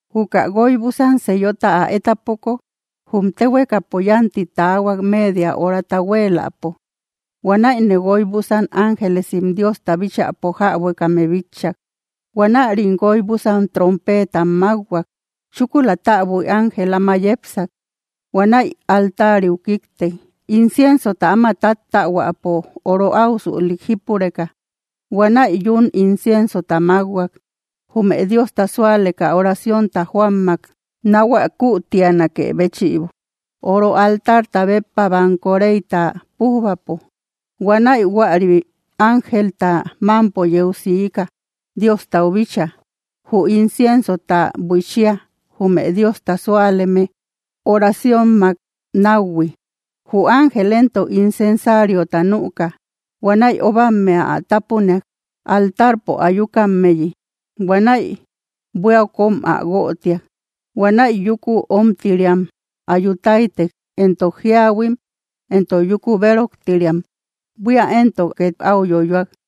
Juka guoy búsan sellota ä étapoko, jum téhuekapo yánti taahuak media horata huéeläpo. Huanäine guoy búsan ángelesim Diosta bíchäpo jäbuekame bitchak. Huanärim guoy búsan trompeetam mákhuak. Chúkula täbui ángel áma yepsak. Huanäi altariu kíktek, inciensota áma táttaahuäpo oro áusülik jípureka. Huanäi yún inciensota mákhuak, jume Diosta súaleka oraciónta joammak nahuä kütianakë béchïbo, oro altarta béppa banko reyta pújbapo. Huanäi juäri ángelta mámpo yeu siika, Diostau bíchaa, jü inciensota buiichia, jume Diosta súaleme oraciónmak náuhui. Jü ángel éntok, incensariota nüka. Huanäi óbammea ä tápuniak, altarpo ayukammeyi. Huanäi buíau kóm ä guötiak. Huanäi yúku omtiriam ayu táytek, éntok jíahuim, éntok yúku béroktiriam; buía éntok két áu yoyoak.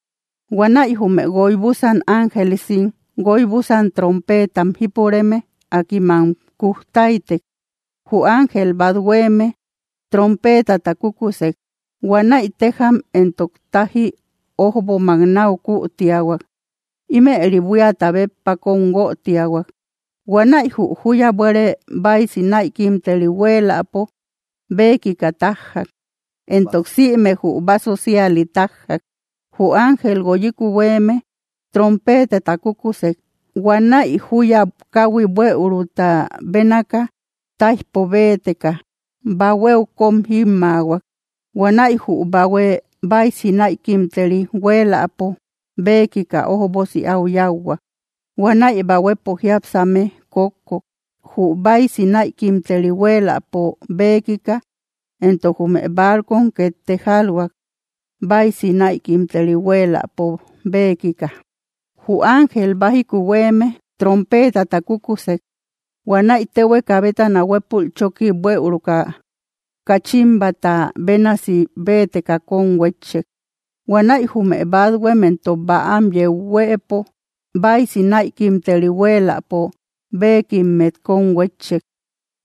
Huanäi jume guoy búsan ángelesim guoy búsan trompeetam jípureme, akim am kujtaytek. Jü ángel bát huéeme trompeetata kúkusek. Huanäi téjam entok táji ójbomak náu kütiahuak. Ímëri buíata béppa kóm guötiahuak. Huanäi jü júya bueere báisi näikimteri huéeläpo béekika tájjak, entok sïme jü báso síali tájjak. Jü ángel guoyiku huéeme trompeetata kúkusek. Huanäi júya káhui buëuruta bénaaka, táijpo béeteka, bahuéu kóm jímmaahuak. Huanäi jü bahue báisi näikimteri huéeläpo béekika ójbosi áu yáuhuak. Huanäi bahuepo jiápsame kókkok, jü báisi näikimteri huéeläpo béekika, entok jume barcom két tejalhuak, báisi näikimteri huéeläpo béekika. Jü ángel bájiku huéeme trompeetata kúkusek. Huanäi téhueka bétana huépul chóki buëuruka kachimbata bénasi béeteka kón huétchek. Huanäi jume bathuem entok bäam yeu huëpo báisi näikimteri huéeläpo béekimmet kón huétchek.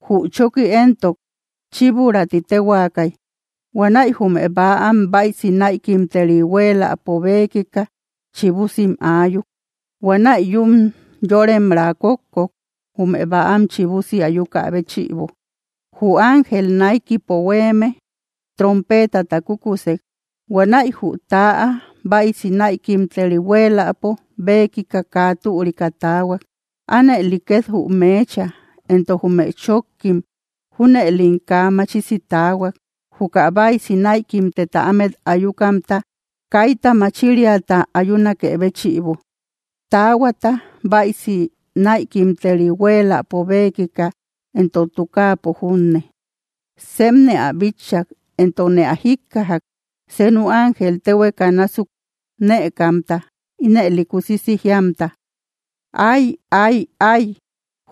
Jü chóki éntok, “Chíburá” ti téhuaakay. Huanäi jume bäam báisi näikimteri huéeläpo béekika chibusim aayuk. Huanäi yún yóremraa kókkok, jume bäam chibusi ayukä béchïbo. Jü ángel naikipo huéeme trompeetata kúkusek. Huanäi jü täa báisi näikimteri huéeläpo béekika kaa türika taahuak; anëli ket jü meecha, entok jume chókkim. Júnëlim kaa machisi taahuak, juka báisi näikimteta ámet ayukamta, kaita machiriata ayunakë béchïbo, taahuata báisi näikimteri huéeläpo béekika, entok tukaapo junne. Sepne ä bitchak, entokne ä jíkkajak, senu ángel téhueka násuk nëkamta, ínëli kusisi jíamta: —¡Ay, ay, ay,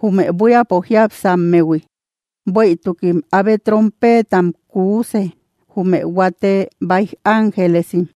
jume buíapo jiápsammehui! ¡Bueïtukim abe trompeetam kuuse, jume huate báij ángelesim!